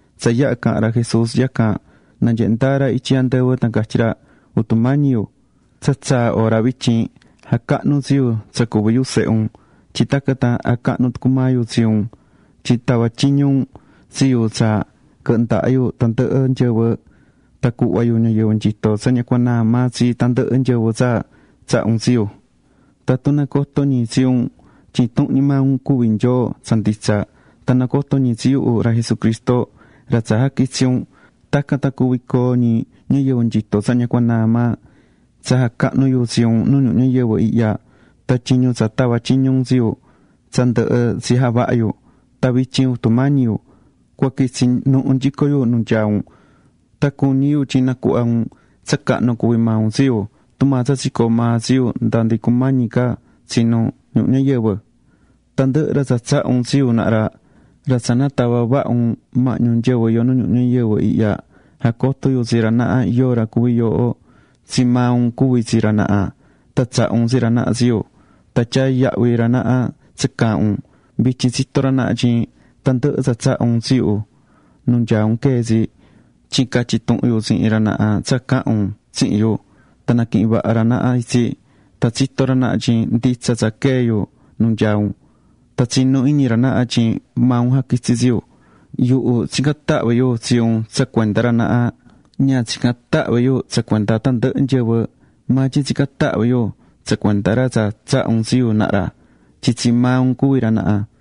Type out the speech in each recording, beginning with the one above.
Tsa yaha̱ caha̱n ra Jesús yacan, nanyehe̱ ndaa ra ityi andɨvɨ tan catyí ra: ―Jutu Mañi yu, tsa tsaa̱ hora vityin. Ja̱cahnu tsi yu tsa cuví yu sehe un, tyin tacan tan jacahnu tucu maa yu tsi un. Tyin tava̱ tyiñu un tsi yu tsa quɨhɨ ndaha yu tandɨhɨ nyɨvɨ, tan cuhva yu ñayɨvɨ nyitó tsa ña cua naa maa tsi tandɨhɨ nyɨvɨ tsa tsaha̱ un tsi yu. Tatun nacotó ñi tsi un tyin intuhun ñi maa un cuví Nyoo tsa nditsa, tan nacotó ñi tsi yuhu ra Jesucristo ra tsa jaquitsi̱ un, tacan tan cuví coo ñi ñayɨvɨ nyitó tsa ña cua naa maa. ’Tsa jacahnu̱ yu tsi un nu ñuhu ñayɨvɨ ihya tan tyiñu tsa tava̱ tyiñu un tsi yu tsa ndɨhɨ tsi javaha̱ yu. Tan vityin, Jutu Mañi yu, cua quitsi nuhu nyico yu nu nyaá un, tan cuñí yu tyin nacuhva un tsa cahnu cuví yu tsihin un tsi yu, tumaa tsa tsicoo̱ maa tsi yu nda ndi cumañi ca tsinu ñuhu ñayɨvɨ. ’Tandɨhɨ ra tsa tsaha̱ un tsi yu naha ra, ra tsa natava̱ vaha un mahñu nyɨvɨ iyó nu ñuhu ñayɨvɨ ihya, jacoto̱ yu tsi ra naha yóo ra cuví yooho. Tsii maa un cuví tsi ra naha tan tsaha̱ un tsi ra naha tsi yu. Tan tyaá yahvi ra naha tsa caahán un. Vityin tsitó ra naha tyin tandɨhɨ tsa tsaha̱ un tsi yu, nu nyaá un quee̱ tsi. Tyin catyi̱ tuhun yu tsihin ra naha tsa caha̱n un tsihin yu, tan naquihi̱n vaha ra naha itsi. Tan tsitó ra naha tyin nditsa tsa quee̱ yu nu nyaá un, tan tsinú iñi ra naha tyin maa un jaquitsi̱ tsi yu. ’Yuhu tsicán tahvi yu tsi un tsa cuenda ra naha. Ña tsicán tahvi yu tsa cuenda tandɨhɨ nyɨvɨ, maa tyin tsicán tahvi yu tsa cuenda ra tsa tsaha̱ un tsi yu naha ra, tyin tsi maa un cuví ra naha.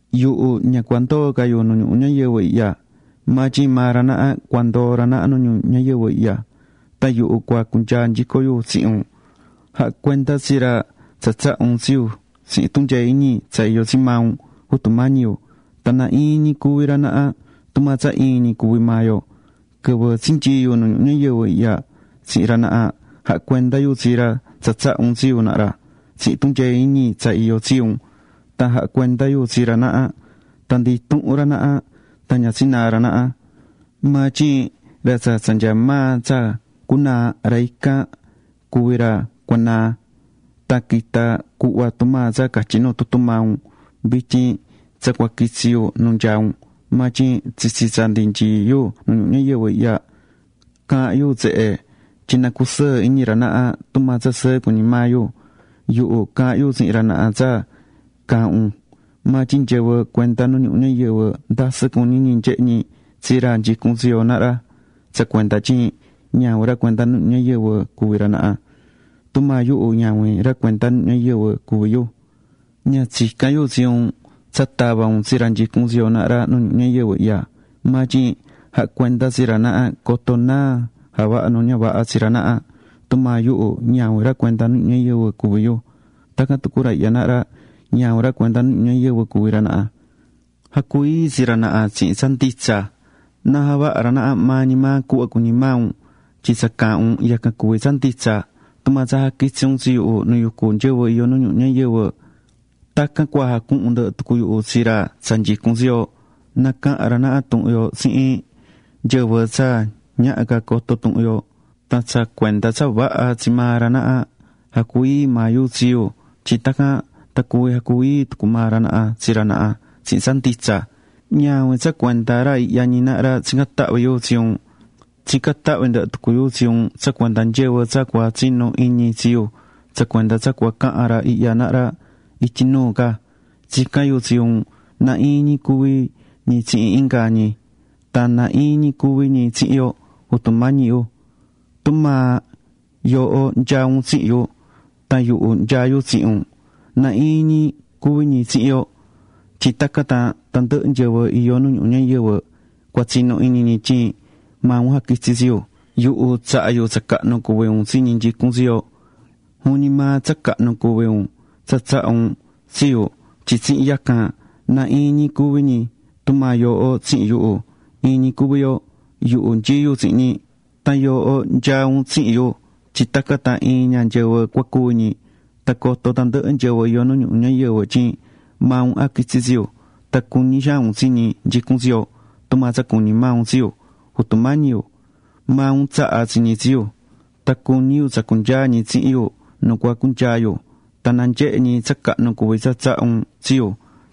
’Yuhu ña cua ndoo ca yu nu ñuhu ñayɨvɨ ihya, maa tyin maa ra naha cua ndoo ra naha nu ñuhu ñayɨvɨ ihya. Tan yuhu cua cunyaa nyico yu tsihin un. Ja̱ha cuenda tsi ra tsa tsaha̱ un tsi yu tsihin tunyee iñi tsa iyó tsi maa un, Jutu Mañi yu. Tan na iin ñi cuvi ra naha, tumaa tsa iin ñi cuví maa yo. Quɨvɨ tsinyii̱ yu nu ñuhu ñayɨvɨ ihya tsihin ra naha, jaha̱ cuenda yu tsi ra tsa tsaha̱ un tsi yu naha ra tsihin tunyee iñi tsa iyó tsi un. Tan jaha̱ cuenda yu tsi ra naha. Tan ndi intuhun ra naha tan ña tsinaa̱ ra naha. Maa tyin ra tsa tsa nyaá maa tsa cunaa, ra ican ñi cuví ra cuanaa̱ tan quita̱ cuhva tumaa tsa catyí nu tutu maa un. ’Vityin tsa cua quitsí yu nu nyaá un, maa tyin tsitsi tsa ndi nyií yu nu ñuhu ñayɨvɨ ihya, caahán yu tsehe, tyin na cusɨɨ iñi ra naha tumaa tsa sɨɨ cuñí maa yu. Yuhu caha̱n yu tsihin ra naha tsa caahán un, maa tyin nyɨvɨ cuenda nu ñuhu ñayɨvɨ ndasɨ cuñí ñi nyehe ñi tsi ra nyicún tsi yo naha ra, tsa cuenda tyin ñavin ra cuenda nu ñuhu ñayɨvɨ cuví ra naha. Tumaa yuhu, ñavin ra cuenda nu ñuhu ñayɨvɨ cuví yu. Ña tsicán yu tsi un tsa tava un tsi ra nyicún tsi yo naha ra nu ñuhu ñayɨvɨ ihya, maa tyin ja̱ha cuenda tsi ra naha coto náa jaha nu ña vaha tsi ra naha. Tumaa yuhu ñavin ra cuenda nu ñuhu ñayɨvɨ cuví yu, tacan tucu ra ihya naha ra, ñavin ra cuenda nu ñuhu ñayɨvɨ cuví ra naha. Ja̱cu ii tsi ra naha tsihin tsa nditsa, na javaha ra naha maa ñi maa cuhva cuñí maa un. Tyin tsa caahán un, yacan cuví tsa nditsa. Tumaa tsa jaquitsi̱ un tsi yuhu nu yucú nyɨvɨ iyó nu ñuhu ñayɨvɨ, tacan cua jacuhun ndɨhɨ tucu yuhu tsi ra tsa nyicún tsi yo, nacahan ra naha tuhun yo tsihin nyɨvɨ tsa ñaha ca coto tuhun yo. Tan tsa cuenda tsa vaha tsi maa ra naha, jacu ii maa yu tsi yu tyin tacan tan cuví jacu ii tucu maa ra naha tsi ra naha tsihin tsa nditsa. ’Ñavin tsa cuenda ra ihya ñi naha ra tsicán tahvi yu tsi un. Tsicán tahvi ndɨhɨ tucu yu tsi un tsa cuenda nyɨvɨ tsa cua tsinu iñi tsi yu, tsa cuenda tsa cua cahan ra ihya naha ra ityi nuu ca. Tsicán yu tsi un na iin ñi cuvi ñi tsihin inga ñi. Tan na iin ñi cuvi ñi tsihin yo, Jutu Mañi yu. Tumaa yooho nyaá un tsihin yu tan yuhu nyaá yu tsihin un, na iin ñi cuví ñi tsihin yo, tyin tacan tan tandɨhɨ nyɨvɨ iyó nu ñuhu ñayɨvɨ cua tsinu iñi ñi tyin maa un jaquitsi̱ tsi yu. Yuhu tsaha̱ yu tsa cahnu cuví un tsi ñi nyicún tsi yo. Juvin ñi maa tsa cahnu cuví un tsa tsaha̱ un tsi yu tyin tsihin yacan na iin ñi cuví ñi, tumaa yooho tsihin yuhu, iin ñi cuví yo. Yuhu nyií yu tsihin ñi. Tan yooho nyaá un tsihin yu tyin tacan tan iin ña nyɨvɨ cua cuvi ñi. Tan coto tandɨhɨ nyɨvɨ iyó nu ñuhu ñayɨvɨ tyin maa un jaquitsi̱ tsi yu, tan cuñí xaan un tsi ñi nyicún tsi yo, tumaa tsa cuñí maa un tsi yu. ’Jutu Mañi yu, maa un tsaha̱ tsi ñi tsi yu. Tan cuñí yu tsa cunyaa ñi tsihin yu nu cua cunyaa yu, tan na nyehe ñi tsa cahnu cuví tsa tsaha̱ un tsi yu,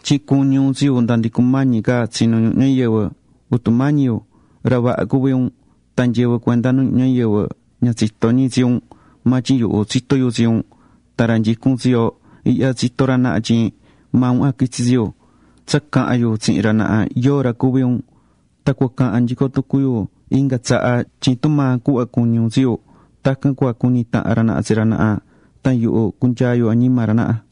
tyin cuñí un tsi yu nda ndi cumañi ca tsinu ñuhu ñayɨvɨ. Jutu Mañi yu, ra vaha cuví un, tan nyɨvɨ cuenda nu ñuhu ñayɨvɨ ña tsitó ñi tsi un, maa tyin yuhu tsitó yu tsi un. Tan ra nyicún tsi yo ihya tsitó ra naha tyin maa un jaquitsi̱ tsi yu. Tsa caha̱n yu tsihin ra naha yóo ra cuví un, tan cua cahan nyico tucu yu inga tsaha, tyin tumaa cuhva cuñí un tsi yu, tacan cua cuñi tahan ra naha tsi ra naha. Tan yuhu cunyaa yu añima ra naha.